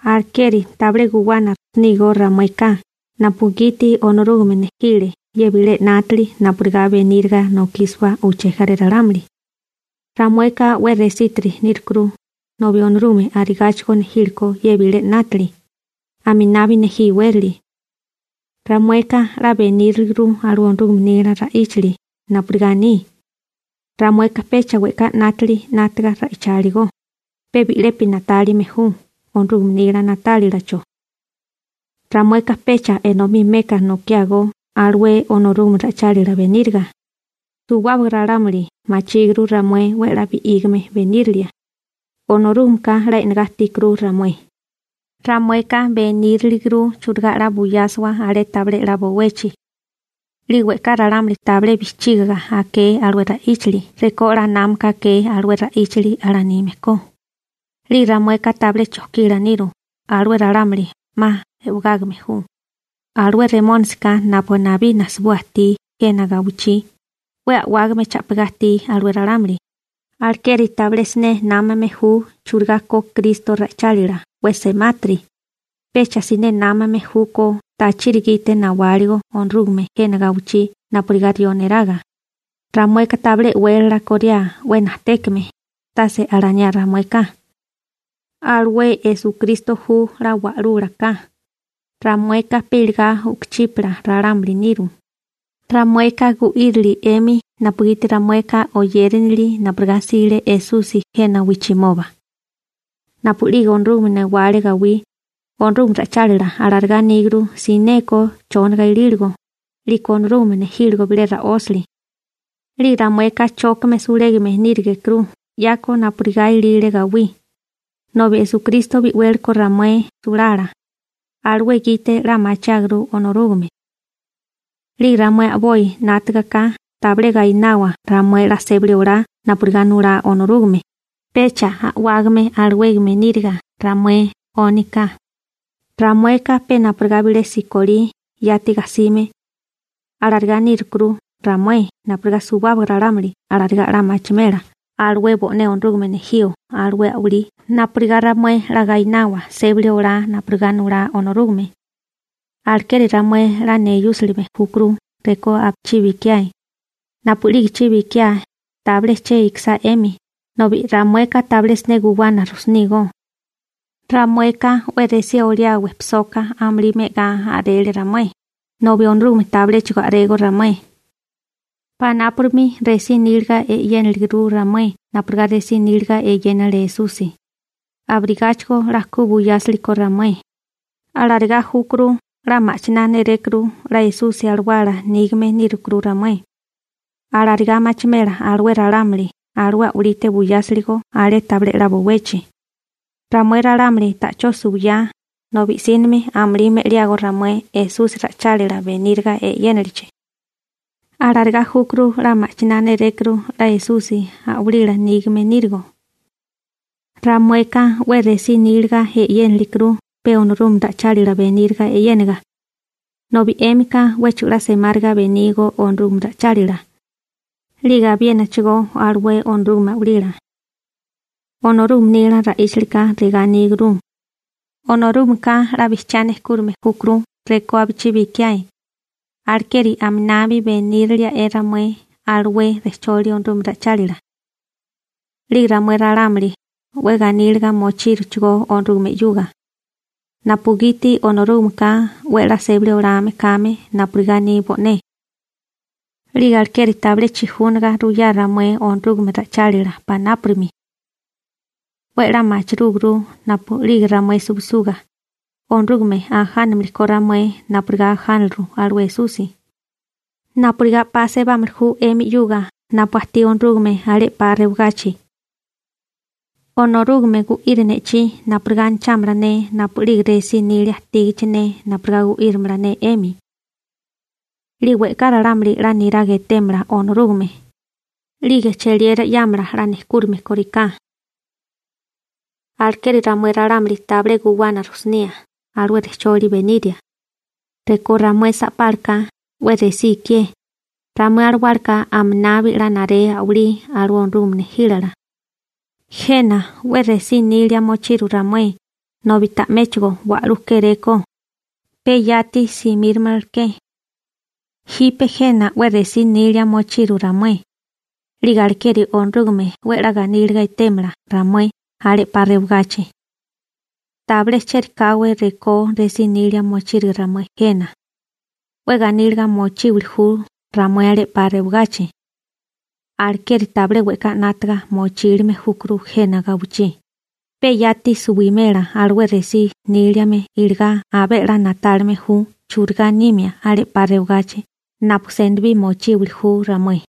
Alekeri tabilé guwana rujsinígó ramueka napugiti Onorúgame nejile ye bilé 'nátili napurigá beníriga nokísiwa uché jaré ralámuli. Ramueka 'we resítiri nírukuru, nobi Onorúgame arigáchigo nejílekó ye bilé 'nátili, aminabi nejí iwérali. Ramueka 'la beníriliguru alué Onorúgame nila ra'íchali napurigá aní. Ramueka pecha we'ká 'nátili 'nátaga ra'icháligo, pe bi'lepi na'tálime ju Onorúgame nila na'tálilacho. Ramueka pecha enomí meka nokiágó alué Onorúgame ra'ichálila beníriga. Suwábaga ralámuli machíguru ramué 'we 'la bi'ígame benírilia. Onorúgameka 'la e'negá ajtíkuru ramué. Ramueka beníriliguru churigá 'la buyásiwa alé tabilé 'la bowechi. 'Lige we'ká ralámuli tabilé bijchígiga aké alué ra'íchali rekó 'la námaka akee alué ra'íchali alanime ko. 'Lige ramueka tabilé chojkila niru, alué ralámuli 'ma e'wegágame ju. Alué Remónisika napu nabí najsibua ajtí jena gawichí, 'we a'wágame cha'pigá ajtí alué ralámuli, alekeri tabilé siné námame ju churigá ko Kristo ra'ichálila 'we semátiri. Pecha siné námame júkó tachiri gite nawáligo Onorúgame jena gawichí napurigá rió neraga. Ramueka tabilé e'wélala koriá 'we najtékame, tase alaniá ramueka. Alué Esukristo ju 'la Wa'lula ka, ramueka pe iligá u'kuchípala ralámuli niru. Ramueka gu'írili 'emi napugiti ramueka oyérinili napurigá 'sile Esusi jena wijchimoba. Napu'lige Onorúgame newale gawí, Onorúgame ra'ichálila alarigá aníguru, sineko chóniga ilíligo, 'liko Onorúgame nejíligo bilé ra'ósali. 'Lige ramueka chókame sulégame nírigekuru 'yako napurigá ilile gawí, nobi Esukristo bi'wéleko ramué sulala. Alué gite 'la machiáguru Onorúgame. 'Lige ramué a'boi 'nátagaká tabilé gainawa ramué 'la sébali olá napurigá nulá Onorúgame, pecha a'wágame alawégame níriga ramué 'ónika. Ramueka pe napurigá bilé sekolí, yati gajsime. Alarigá nírukuru ramué napurigá suwábaga ralámuli alarigá 'la machimela alué bo'né Onorúgame nejío alué a'walí napurigá ramué 'la gaináwala sébali olá napurigá nulá Onorúgame. Alekeri ramué 'la neyúsilime júkuru rekó napuchibi ikiáe. Napu'lige chibi ikiáe, tabilé che ikisá 'emi, nobi ramueka tabilé siné guwana rujsunígó. Ramueka 'we resí oliá wejpisoka amulí me'agá a'rele ramué, nobi Onorúgame tabiléchigo a'régó ramué. Panápurimi resí níliga e'yéniliguru ramué napurigá resí níliga eyénale Esusi. Abirigáchigo 'la ku buyásirikó ramué. Alarigá júkuru 'la ma'chiná nérékuru 'la Esusi Alawala nígame nírukuru ramué. Alarigá machimela alué ralámuli alué a'walite buyásiligo alé tabilé 'la bowechi. Ramué ralámuli ta'chó suwiyá, nobi i'sínimi amulí me'liágó ramué Esusi ra'ichálila beníriga e'yénilichi. Alarigá júkuru 'la ma'chiná nérékuru 'la Esusi a'walila nígame nírigo. Ramueka 'we resí níliga e'yénakuru pe Onorúgame ra'ichálila beníriga e'yéniga, nobi 'émika 'wéchigo 'la semáriga benígó Onorúgame ra'ichálila 'lige abiénachigó alué Onorúgame a'walila. Onorúgame nila ra'íchalika regá aníguru: «Onorúgameka 'la bijchiá nejkúrame júkuru rekó abichibi ikiae, alekeri aminabi beníraliae ramué alué rejcholi Onorúgame ra'ichálila.» 'Lige ramué ralámuli 'we ganíliga mochíruchigó Onorúgame 'yuga, napugiti Onorúgameka 'we a'lá sébali olame kame napurigá aní bo'né. 'Lige alekeri tabilé chijúnaga ruyá ramué Onorúgame ra'ichálila panápurimi. 'We 'la machirúguru napu'lige ramué suwisuga, Onorúgame ajánamilikó ramué napurigá ajánaliru alué Esusi, napurigá 'pa sebámili ju 'emi 'yuga napu ajtí Onorúgame alé 'pa rewagachi. Onorúgame gu'iri ne'chí napurigá anachámala ne napu'lige resí nilia ajtígichi ne napurigá gu'írimala ne 'emi. 'Lige we'ká ralámuli 'la niraga etémala Onorúgame, 'lige cheliera 'yámala 'la nejkúrime kóriká. Alekeri ramué ralámuli tabilé guwana rujsunía alué rejcholi beniria. Rekó ramué sa'pálaka 'we resí ikié, ramué alawálaka aminabi 'la naré a'walí alué Onorúgame nejílala. Jena 'we resí nília mochiru ramué nobi ta'méchigo wa'lú kéréko, pe yati simíramalaké. Jipe jena 'we resí nilia mochiru ramué, 'lige alekeri Onorúgame 'we 'la ganíliga etémala ramué alé re'pá rewagachi. Tabilé chieri káwé rekó resí nilia mochírige ramué jena, 'we ganíliga mochímili ju ramué alé re'pá rewagachi. Alekeri tabilé we'ká 'nátaga mochílime júkuru jena gawichí, pe yati suwimela alué resí níliame iligá abé 'la na'tálime ju churigá nimia alé 'pa rewagachi napu senibí mochíbuli ju ramué.